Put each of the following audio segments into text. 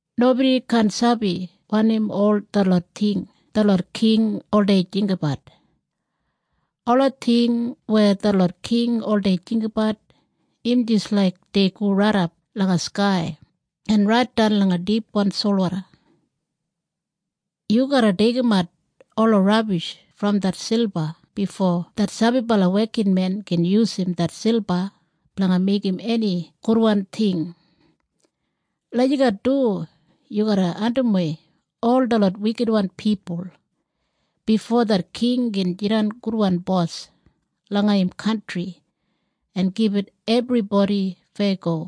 Nobodi kaan sabi wanim ol detlot ting detlot king oldei jinggabat. Ola ting weya detlot king oldei jinggabat im jis laik dei go raidap langa skai en raitdan langa dipwan solwoda. Yu garra deigimat ola rabish brom det silba bifo det sabibala wekinmen gin yusum det silba blanga meigim eni gudwan ting. Lagijat du yu garra andimwei ol detlot wikitwan pipul, bifo det king gin jidan gudwan bos langa im kantri en gibit ebribodi feyago.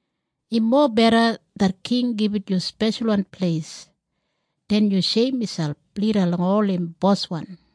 Im mobeda det king gibit yu speshalwan pleis, den yu sheim miselp lida langa ol im boswan.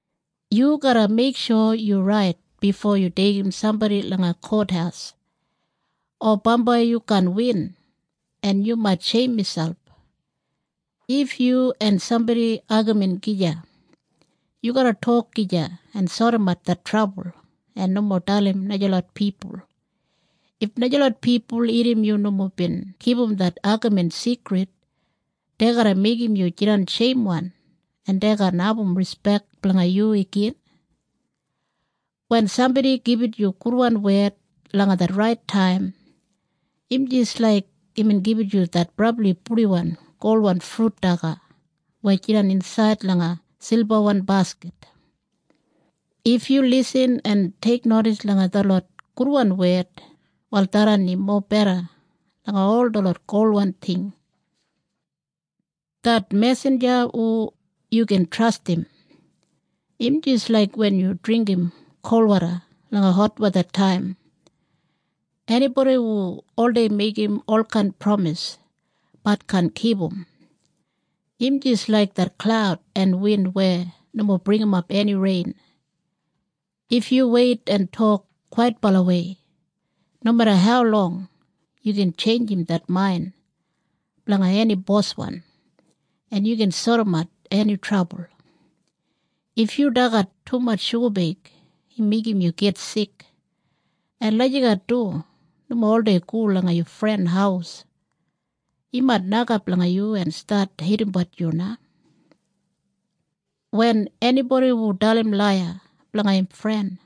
Yu garra meiksho yu rait bifo yu deigim sambodi langa kothaus, o bambai yu kaan win en yu mait sheim miselp. If yu en sambodi agamin gija, yu garra tok gija en sodimat det trabul en nomo dalim najalot pipul. If najalot pipul irrim yu nomo bin kipum det agamin sigrid, dei garra meigim yu jidan sheimwan en dei kaan abum rispek blanga yu igin. Wen sambodi gibit yu gudwan wed langa det rait taim im jis laik imbin gibit yu det brabli purdiwan golwan frut daga weya jidan insaid langa silbawan baskit. If yu lisin en teiknodis langa detlot gudwan wed, wal tharran im mobeda langa ol detlot golwan ting. Det mesinja hu yu gin trastim, im jis laik wen yu dringgim kol woda langa hotwethataim. Enibodi hu oldei meigim olkain pramis, bat kaan kipum, im jis laik det klaud en win weya nomo bringimap eni rein. If yu weit en tok kwaitbalawei, nomeda haulong, yu gin tjeinjim det main blanga eni boswan, en yu gin sodimat eni trabul. If yu dagat tumatj shugabeig im meigim yu git sik. En lagijat du nomo oldei go langa yu fren haus. Im mait nokap langa yu en stat heidimbat yu na. Wen enibodi hu dalim laiya blanga im fren,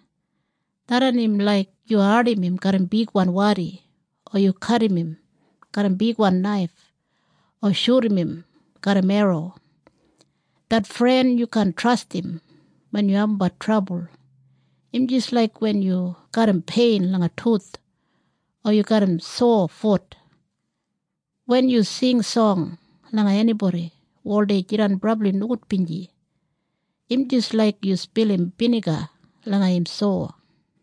tharran im laik yu ardim im garram bigwan wadi o yu kadim im garram bigwan naif o shudum im garram erro. Det fren yu kaan trastim wen yu abumbat trabul im jis laik wen yu garram pein langa tuth o yu garram sowa fut. Wen yu sing song langa enibodi hu oldei jidan brabli nogudbinji, im jis laik yu spilim biniga langa im sowa.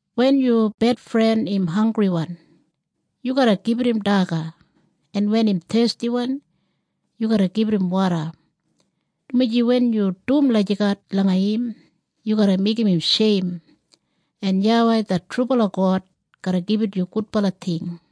Wen yu bedfren im hanggriwan yu garra gibit im daga. En wen im thestiwan yu garra gibit im woda, dumaji wen yu dum lagijat langa im yu garra meigim im sheim, en YAWEI det trubala God garra gibit yu gudbala ting.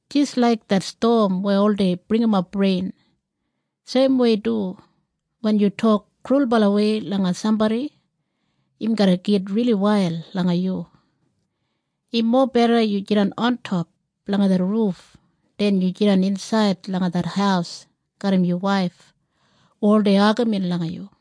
Jis laik det stom weya oldei bringimap rein, seimwei du wen yu tok krulbalawei langa sambodi, im garra git rili wail langa yu. Im mobeda yu jidan ontop langa det ruf den yu jidan insaid langa det haus garram yu waif hu oldei agamin langa yu.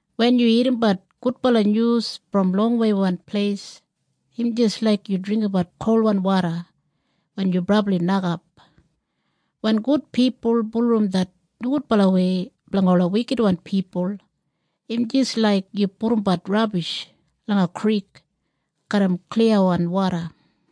Wen yu irrimbat gudbala nyus brom longweiwan pleis im jis laik yu dringgimbat kolwan woda wen yu brabli nokap. Wen gud pipul bulurrum det nogudbalawei blanga ola wikitwan pipul, im jis laik yu pudumbat rabish langa krik garram kliyawan woda.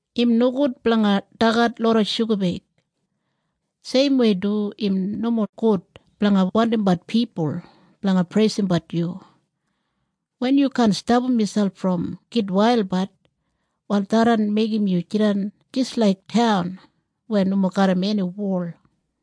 Im nogud blanga dagat loda shugabeig. Seimwei du im nomo gud blanga wandimbat pipul blanga preisimbat yu. Wen yu kaan stapam miselp brom gitwailbat, wal tharran meigim yu jidan jis laik taun weya nomo garram eni wol.